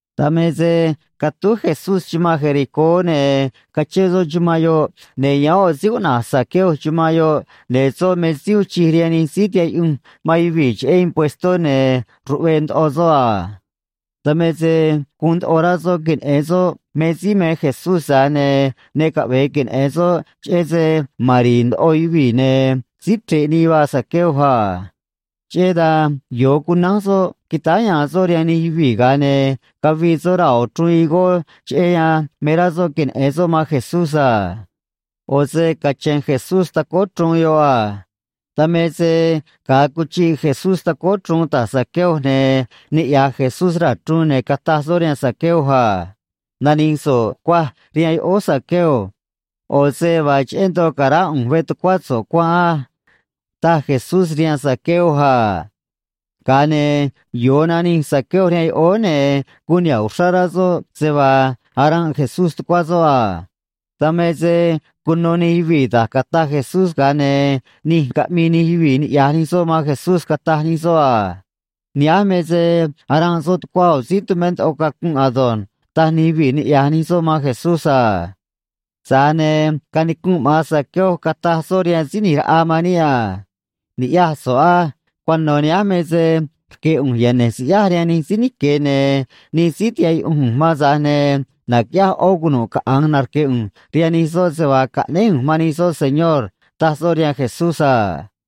Dan me se catúj Jesucristó chumanꞌ Jericó, ne̱ cachén soꞌ chumanꞌ yoꞌ, ne̱ yáán ꞌo̱ síí cuꞌna̱j Zaqueo chumanꞌ yoꞌ, ne̱ soꞌ me síí uun chij rihaan nij síí tihaꞌ yuꞌunj man yuvii̱ cheꞌé puextó, ne̱ ruꞌve̱e̱ ndoꞌo soꞌ a. Dan me se guun rá soꞌ queneꞌe̱n soꞌ me síí me Jesucristó, tza̱j ne̱ ne caꞌve̱e queneꞌe̱n soꞌ, cheꞌé se ma̱n ndoꞌo yuvii̱, ne̱ síí chre̱ꞌ nii vaa síí cuꞌna̱j Zaqueo a. Cheꞌé dan yo̱o cunánj soꞌ quitáá ya̱a̱n soꞌ rihaan nij yuvii̱, ga̱a ne̱ cavii soꞌ raa̱ ꞌo̱ chruun ma̱n chruj higó raa̱, cheꞌé yan me rá soꞌ queneꞌe̱n soꞌ man Jesucristó a. ꞌO̱ se cache̱n Jesucristó tacóó chruun yoꞌ a. Dan me se ga̱a cuchiꞌ Jesucristó tacóó chruun ta̱j Zaqueo, ne̱ niꞌya̱j Jesucristó raa̱ chruun, ne̱ cataj soꞌ rihaan Zaqueo a: ―Nani̱j so̱ꞌ cuaj rihaan yoꞌóó, Zaqueo. ꞌO̱ se vaa cheꞌé ndoꞌo ca̱ránꞌ ꞌu̱nj veꞌ tucuá so̱ꞌ cuanꞌ á ―taj Jesucristó rihaan Zaqueo a. Ga̱a ne̱ yo̱o nanij Zaqueo rihaan yoꞌóó, ne̱ guun niha̱ꞌ uxrá rá soꞌ se vaa cara̱nꞌ Jesucristó tucuá soꞌ a. Dan me se cuno nij yuvii̱ da̱j cataj Jesucristó, ga̱a ne̱ nij caꞌmii nij yuvii̱ niꞌya̱j nij soꞌ man Jesucristó a. Ne̱ cataj nij soꞌ cheꞌé Jesucristó a: ―Nihánj me se cara̱nꞌ soꞌ tucuá ꞌo̱ síí tumé ndoꞌo cacunꞌ ado̱nj ―taj nij yuvii̱ niꞌya̱j nij soꞌ man Jesucristó a. Tza̱j ne̱ canicunꞌ maꞌa̱n Zaqueo, cataj soꞌ rihaan síí ꞌni̱j raꞌa man níꞌ a: ―Cuano̱ nihánj me se rque̱ ꞌu̱nj yane̱j siꞌyáj rihaan nij síí nique̱, ne̱ nij síí tihaꞌ yuꞌunj ꞌu̱nj man, tza̱j ne̱ na̱quiꞌyáj ꞌó cunu̱ꞌ caꞌa̱nj narque̱ ꞌu̱nj rihaan nij soꞌ se vaa caꞌnéj ꞌu̱nj man nij soꞌ, Señor ―taj soꞌ rihaan Jesucristó a.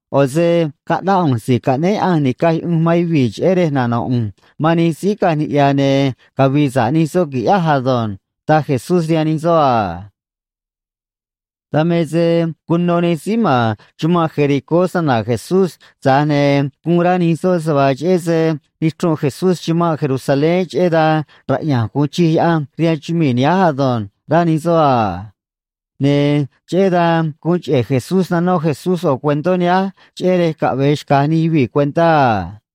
ꞌO̱ se caꞌnáꞌ ꞌu̱nj si̱j nica̱j yuꞌunj man yuvii̱ cheꞌé rej caꞌve̱e nano̱ꞌ ꞌu̱nj man nij síí caꞌanj niꞌya̱, ne̱ cavi̱i̱ sa̱ꞌ nij soꞌ qui̱ꞌyáj ado̱nj ―taj Jesucristó rihaan nij soꞌ a. Dan me se cuno nij síí ma̱n chumanꞌ Jericó se‑na̱na̱ Jesucristó, tza̱j ne̱ guun rá nij soꞌ se vaa cheꞌé se nichrunꞌ Jesucristó chumanꞌ Jerusalén, cheꞌé dan raꞌya̱nj gu̱un chij Diose̱ rihaan chumii̱ nihánj ado̱nj, rá nij soꞌ, ne̱ cheꞌé dan guun cheꞌe̱ Jesucristó naquiꞌyaj Jesucristó yoꞌo̱ cuentó nihánj, ga̱a ne̱ caꞌve̱e xca̱j nij yuvii̱ cuentá a.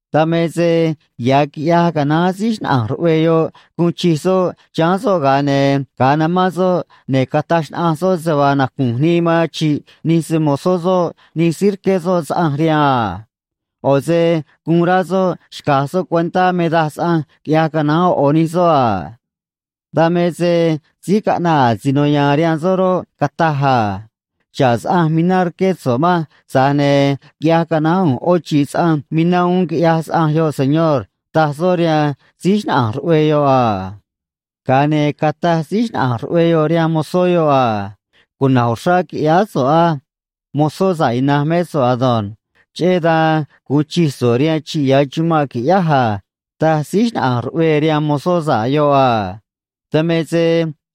”Dan me se ya̱ quiꞌyaj canaán síí xnaꞌa̱nj ruꞌvee yoꞌ guun chij soꞌ chiháán soꞌ, ga̱a ne̱ ga̱a namán soꞌ, ne̱ cataj xnaꞌanj soꞌ se vaa nacu̱nj nii man chi̱ꞌ nij se‑mo̱zó soꞌ nij síí rqué soꞌ saꞌanj rihaan a. ꞌO̱ se guun rá soꞌ xca̱j soꞌ cuentá me daj saꞌanj quiꞌyaj canaán nij soꞌ a. ”Dan me se síí caꞌnaꞌ asino ya̱a̱n rihaan soꞌ roꞌ, cataj: “Xa̱ꞌ saꞌanj mina rqué so̱ꞌ manj, tza̱j ne̱ quiꞌyaj canaán ꞌu̱nj ꞌó chi̱ꞌ saꞌanj mina uún, quiꞌyaj saꞌanj yoꞌ, señor”, taj soꞌ rihaan síí xnaꞌa̱nj ruꞌvee yoꞌ a. Ga̱a ne̱ cataj síí xnaꞌa̱nj ruꞌvee yoꞌ rihaan mozó yoꞌ: “Cuna̱j uxrá quiꞌyáá so̱ꞌ á. Mozó sa̱ꞌ ina̱nj mé so̱ꞌ ei. Cheꞌé dan gu̱un chij so̱ꞌ rihaan chi̱ꞌ ya̱ chumanꞌ, qui̱ꞌyáj a”, taj síí xnaꞌa̱nj ruꞌvee rihaan mozó sa̱ꞌ yoꞌ a. ”Dan me se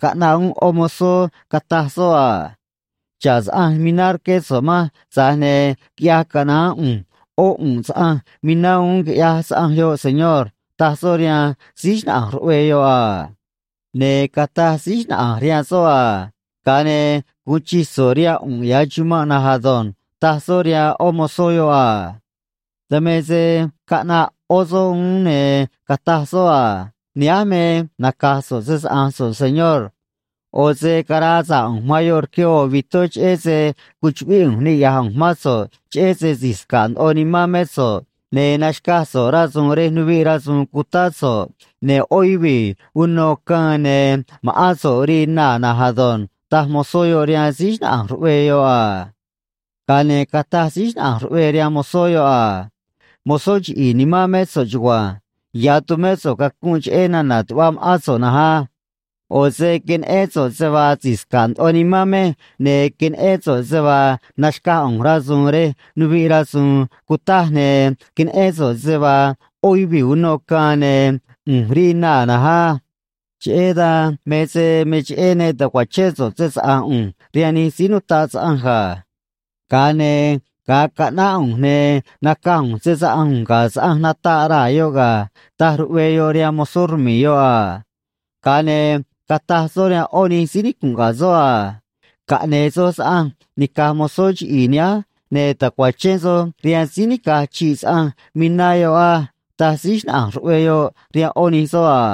caꞌnaꞌ uún yoꞌó mozó, cataj soꞌ: “Xa̱ꞌ saꞌanj mina rqué so̱ꞌ manj, tza̱j ne̱ quiꞌyaj canaán ꞌu̱nj yuꞌunꞌ saꞌanj mina uún, quiꞌyaj saꞌanj yoꞌ, señor”, taj soꞌ rihaan síí xnaꞌa̱nj ruꞌvee yoꞌ a. Ne̱ cataj síí xnaꞌa̱nj rihaan soꞌ: “Ga̱a ne̱ gu̱un chij so̱ꞌ rihaan ꞌu̱nꞌ ya̱ chumanꞌ na̱nj ei”, taj soꞌ rihaan yoꞌó mozó yoꞌ a. ”Dan me se caꞌnaꞌ yoꞌó soꞌ uún, ne̱ cataj soꞌ: “Nihánj me naca̱j so̱ꞌ se‑saꞌa̱nj so̱ꞌ, señor. ꞌO̱ se caraa sa̱ꞌ ꞌu̱nj man yoꞌ rque ꞌo̱ vitó, ne̱ cuchuꞌvíꞌ ꞌu̱nj niꞌya̱j ꞌu̱nj mán so̱ꞌ, cheꞌé se si̱j sca̱ꞌ ndoꞌo nimán mé so̱ꞌ, ne̱ naxca̱j so̱ꞌ rasu̱u̱n rej nuviꞌ rasu̱u̱n cutáꞌ so̱ꞌ, ne̱ yoꞌó yuvii̱ unô caân, ne̱ so̱ꞌ me se, ne̱ ma̱ꞌán so̱ꞌ, ne̱ rii so̱ꞌ naa̱ ado̱nj”, taj mozó yoꞌ rihaan síí xnaꞌa̱nj ruꞌvee yoꞌ a. ”Ga̱a ne̱ cataj síí xnaꞌa̱nj ruꞌvee rihaan mozó yoꞌ: “Mozó chiꞌi̱i̱ nimán mé so̱ꞌ ei. Cuta̱ꞌ ꞌu̱nj cacunꞌ xráá so̱ꞌ cheꞌé nana̱ tuꞌva ma̱ꞌán so̱ꞌ á. ꞌO̱ se queneꞌén so̱ꞌ se vaa si̱j sca̱ꞌ ndoꞌo nimán mej, ne̱ queneꞌén so̱ꞌ se vaa naxca̱j ꞌu̱nj rasu̱u̱n rej nuviꞌ rasu̱u̱n cutaj, ne̱ queneꞌén so̱ꞌ se vaa yoꞌó yuvii̱ unô caân ne̱ ꞌu̱nj rii naa̱ na̱nj á. Cheꞌé dan me cheꞌé ne ta̱cuachén so̱ꞌ se‑saꞌa̱nj ꞌu̱nj rihaan nij síí nutaꞌ saꞌanj ga̱. Ga̱a ne̱ ga̱a caꞌnáꞌ ꞌu̱nj, ne̱ nacaj ꞌu̱nj se‑saꞌa̱nj ꞌu̱nj ga̱ saꞌanj nataꞌ raa̱ yoꞌ ga̱”, taj síí xnaꞌa̱nj ruꞌvee yoꞌ rihaan mozó rmi̱i̱ yoꞌ a. Ga̱a ne̱ cataj soꞌ rihaan yoꞌó nij síí nicu̱nꞌ ga̱ soꞌ a: “Caꞌne̱e̱ soj saꞌanj nica̱j mozó chiꞌi̱i̱ nihánj, ne̱ ta̱cuachén soj rihaan síí nica̱j chi̱ꞌ saꞌanj mina yoꞌ á”, taj síí xnaꞌa̱nj ruꞌvee yoꞌ rihaan yoꞌó nij soꞌ a.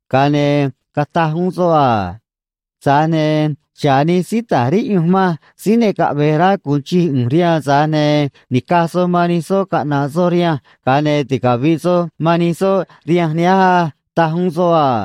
Ga̱a ne̱ cataj uún soꞌ: “Tza̱j ne̱ xa̱ꞌ nij síí ta̱j riꞌyunj manj síí ne caꞌve̱j rá gu̱un chij ꞌu̱nj rihaan, tza̱j ne̱ ni̱caj soj man nij soꞌ caꞌna̱ꞌ soj rihanj, ga̱a ne̱ ticavi̱ꞌ soj man nij soꞌ rihanj nihánj ei”, taj uún soꞌ a.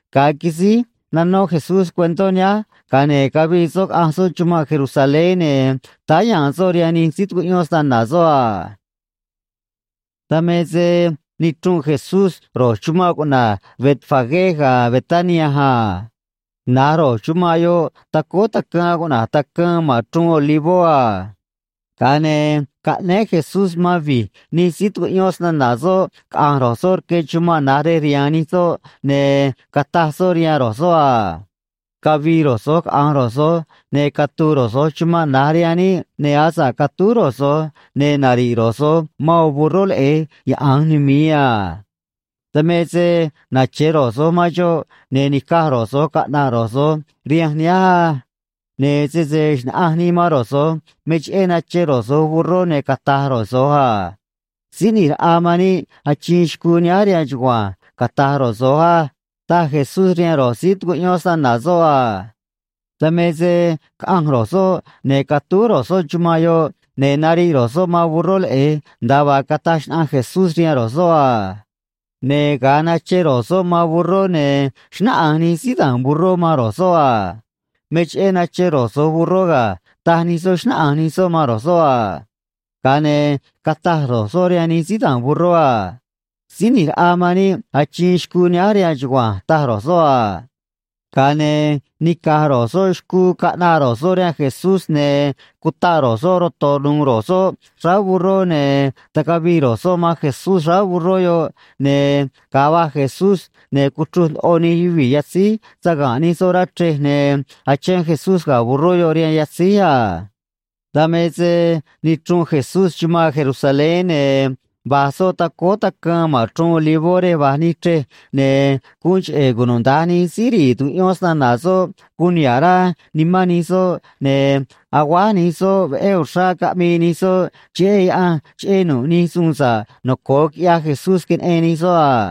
―Veé da̱nj quisíj cuentó nanó Jesucristó a. Ga̱a ne̱ cavii soꞌ caꞌanj soꞌ chumanꞌ Jerusalén, ne̱ táá ya̱a̱n soꞌ rihaan nij síí tucuꞌyón se‑na̱na̱ soꞌ a. Dan me quinichrunꞌ Jesucristó ro̱j chumanꞌ cuꞌna̱j Betfagé ga̱ Betania a. Na̱j ro̱j chumanꞌ yoꞌ tacóó quij cuꞌna̱j Quij ma̱n Chruun Olivó a. Ga̱a ne̱ caꞌnéé Jesucristó man vi̱j tuviꞌ nij síí tucuꞌyón se‑na̱na̱ soꞌ caꞌa̱nj rque chumanꞌ Betfagé, ne̱ cataj soꞌ rihaan ro̱j soꞌ a: ―Cavi̱i̱ ro̱j so̱j caꞌa̱nj soj, ne̱ catu̱u̱ ro̱j so̱j chumanꞌ nihánj chumanꞌ na̱j rihaan níꞌ, ne̱ asa̱ꞌ catúj ro̱j so̱j, ne̱ nari̱ꞌ ro̱j so̱j man yoꞌo̱ burró leꞌe̱j yaꞌa̱nj numi̱i a. Dan me se nache̱ ro̱j so̱j man xoꞌ, ne̱ ni̱caj ro̱j so̱j caꞌna̱ꞌ ro̱j so̱j rihanj nihánj á. Ne̱ sese xna̱ꞌanj nii man ro̱j so̱j me cheꞌé nache ro̱j so̱j burró, ne̱ cata̱j ro̱j so̱j: “Síí ꞌni̱j raꞌa man níꞌ achiin xcuu nihánj rihaan chugua̱nj”, cata̱j ro̱j so̱j á ―taj Jesucristó rihaan ro̱j síí tucuꞌyón se‑na̱na̱ soꞌ a. Dan me se caꞌanj ro̱j soꞌ, ne̱ catúj ro̱j soꞌ chumanꞌ yoꞌ, ne̱ nariꞌ ro̱j soꞌ man burró leꞌe̱j, nda̱a vaa cataj xnaꞌanj Jesucristó rihaan ro̱j soꞌ a. Ne̱ ga̱a nache ro̱j soꞌ man burró, ne̱ xnáꞌanj nij síí da̱a̱n burró man ro̱j soꞌ a: ―Me cheꞌé nache soj burró ga̱ ―taj nij soꞌ, xnáꞌanj nij soꞌ man ro̱j soꞌ a. Ga̱a ne̱ cataj ro̱j soꞌ rihaan nij síí da̱a̱n burró a: ―Síí ꞌni̱j raꞌa man níꞌ achiin xcuu nihánj rihaan chugua̱nj ―taj ro̱j soꞌ a. Ga̱a ne̱ nica̱j ro̱j soꞌ xcuu caꞌnaꞌ ro̱j soꞌ rihaan Jesucristó, ne̱ cutaꞌ ro̱j soꞌ saga̱nꞌ ro̱j soꞌ xráá burró, ne̱ tacavii ro̱j soꞌ man Jesucristó xráá burró yoꞌ, ne̱ ga̱a va̱j Jesucristó, ne̱ cuchruj ndoꞌo nij yuvii̱ yatzíj saga̱nꞌ nij soꞌ rá chrej, ne̱ achén Jesucristó ga̱ burró yoꞌ rihaan yatzíj a. Dan me se quinichrunꞌ Jesucristó chumanꞌ Jerusalén, ne̱ va̱j soꞌ tacóó Quij ma̱n Chruun Olivó rej va̱j ni̱j chrej, ne̱ guun cheꞌe̱ queꞌe̱e̱ nij síí tucuꞌyón se‑na̱na̱ soꞌ guun niha̱ꞌ rá nij soꞌ, ne̱ aguáj nij soꞌ, caꞌmii sa̱ꞌ nij soꞌ cheꞌé Diose̱ cheꞌé nu̱ꞌ nij suun sa̱ꞌ noco̱o quiꞌyaj Jesucristó queneꞌen nij soꞌ a.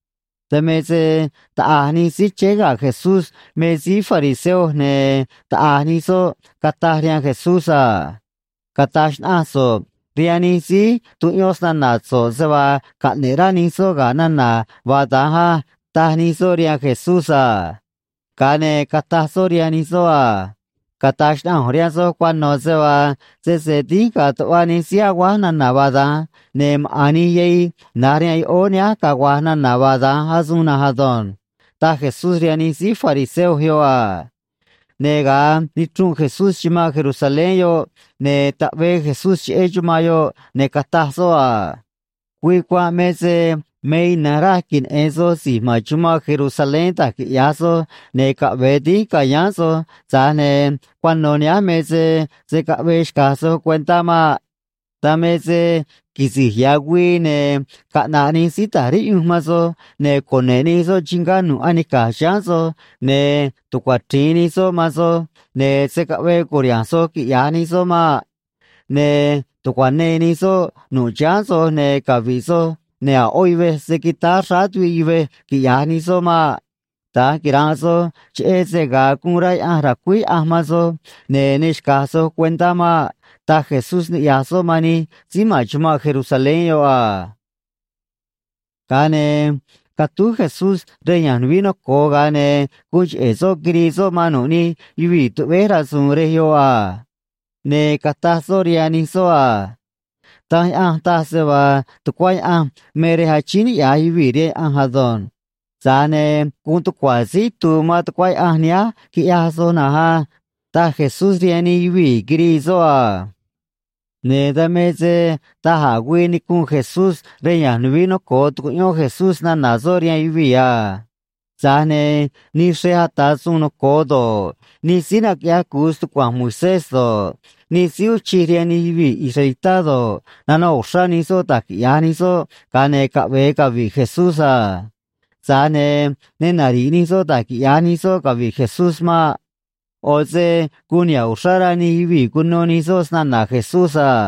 Dan me se taꞌa̱j nij síí chéé ga̱ Jesucristó me síí fariseo, ne̱ taꞌa̱j nij soꞌ cataj rihaan Jesucristó a: ―Cata̱j xnaꞌanj so̱ꞌ rihaan nij síí tucuꞌyón se‑na̱na̱ so̱ꞌ se vaa caꞌne̱ꞌ rá nij soꞌ ga̱ nana̱ vaa da̱nj á ―taj nij soꞌ rihaan Jesucristó a. Ga̱a ne̱ cataj soꞌ rihaan nij soꞌ a: ―Cata̱j xnaꞌanj ꞌu̱nj rihaan soj cuano̱ se vaa sese dínj ga̱a̱ tuꞌva nij síí aguáj nana̱ vaa da̱nj, ne̱ maꞌa̱n nij yahij na̱j rihaan yoꞌóó nihánj cagua̱j nana̱ vaa da̱nj asuun na̱nj ado̱nj ―taj Jesucristó rihaan nij síí fariseo yoꞌ a. Ne̱ ga̱a quinichrunꞌ Jesucristó chumanꞌ Jerusalén yoꞌ, ne̱ taꞌvee Jesucristó cheꞌé chumanꞌ yoꞌ, ne̱ cataj soꞌ: ―Güii cuanꞌ me se me ina̱nj raj queneꞌe̱n soj si̱j ma̱n chumanꞌ Jerusalén da̱j quiꞌya̱j soj ne̱ caꞌve̱e dínj ca̱yáán soj, tza̱j ne̱ cuano̱ nihánj me se se̱ caꞌvee xca̱j soj cuentá maꞌ. Dan me se quisi̱j ya̱ güii, ne̱ caꞌna̱ꞌ nij síí ta̱j riꞌyunj man soj, ne̱ cune̱ꞌ nij soꞌ chingá nu̱ꞌ anica̱j chiháán soj, ne̱ tucuachri̱in nij soꞌ man soj, ne̱ se̱ caꞌvee cu̱riha̱nj soj, quiꞌya̱j nij soꞌ maꞌ. Ne̱ tu̱cuanee nij soꞌ nu̱ꞌ chiháán soj, ne̱ cavi̱ꞌ soj, ne̱ a̱ ꞌó yuvej se̱ quitáá xráá tuviꞌ yuvej, quiꞌya̱j nij soꞌ maꞌ. Da̱nj quira̱nꞌ soj, cheꞌé se ga̱a guun rá Diose̱ ra̱cuíj Diose̱ man soj, ne̱ ne xca̱j soj cuentá maꞌ ―taj Jesucristó niꞌya̱j soꞌ man nij síí ma̱n chumanꞌ Jerusalén yoꞌ a. Ga̱a ne̱ catúj Jesucristó rá nuvií noco̱o, ga̱a ne̱ guun cheꞌe̱ soꞌ quirii soꞌ man nu̱ꞌ nij yuvii̱ tuꞌvéj rasu̱u̱n ma̱n rá nuvií noco̱o a. Ne̱ cataj soꞌ rihaan nij soꞌ a: ―Danj Diose̱ taj se vaa tucuá Diose̱ me rej naꞌvíj yuvii̱ rihaan Diose̱ á. Tza̱j ne̱ guun tucua̱ síí itu̱u̱ man tucuá Diose̱ nihánj, quiꞌyaj soj na̱nj á ―taj Jesucristó rihaan nij yuvii̱ quirii soꞌ a. Ne̱ dan me se daj a̱ güii nicunꞌ Jesucristó rá nuvií noco̱o, tucuꞌyón Jesucristó se‑na̱na̱ soꞌ rihaan yuvii̱, tza̱j ne̱ nij xrej ata̱ suun noco̱o doj do̱ꞌ, nij síí naquiꞌyaj cu̱u se‑tucua̱nj Moisés rihaan yuvii̱ do̱ꞌ, nij síí uun chij rihaan nij yuvii̱ israelitá do̱ꞌ, nanoꞌ uxrá nij soꞌ da̱j quiꞌya̱j nij soꞌ ga̱a ne̱ caꞌve̱e cavi̱ꞌ Jesucristó a. Tza̱j ne̱ ne nari̱ꞌ nij soꞌ da̱j quiꞌya̱j nij soꞌ cavi̱ꞌ Jesucristó maꞌ. ꞌO̱ se guun niha̱ꞌ uxrá rá nij yuvii̱ cuno nij soꞌ se‑na̱na̱ Jesucristó a.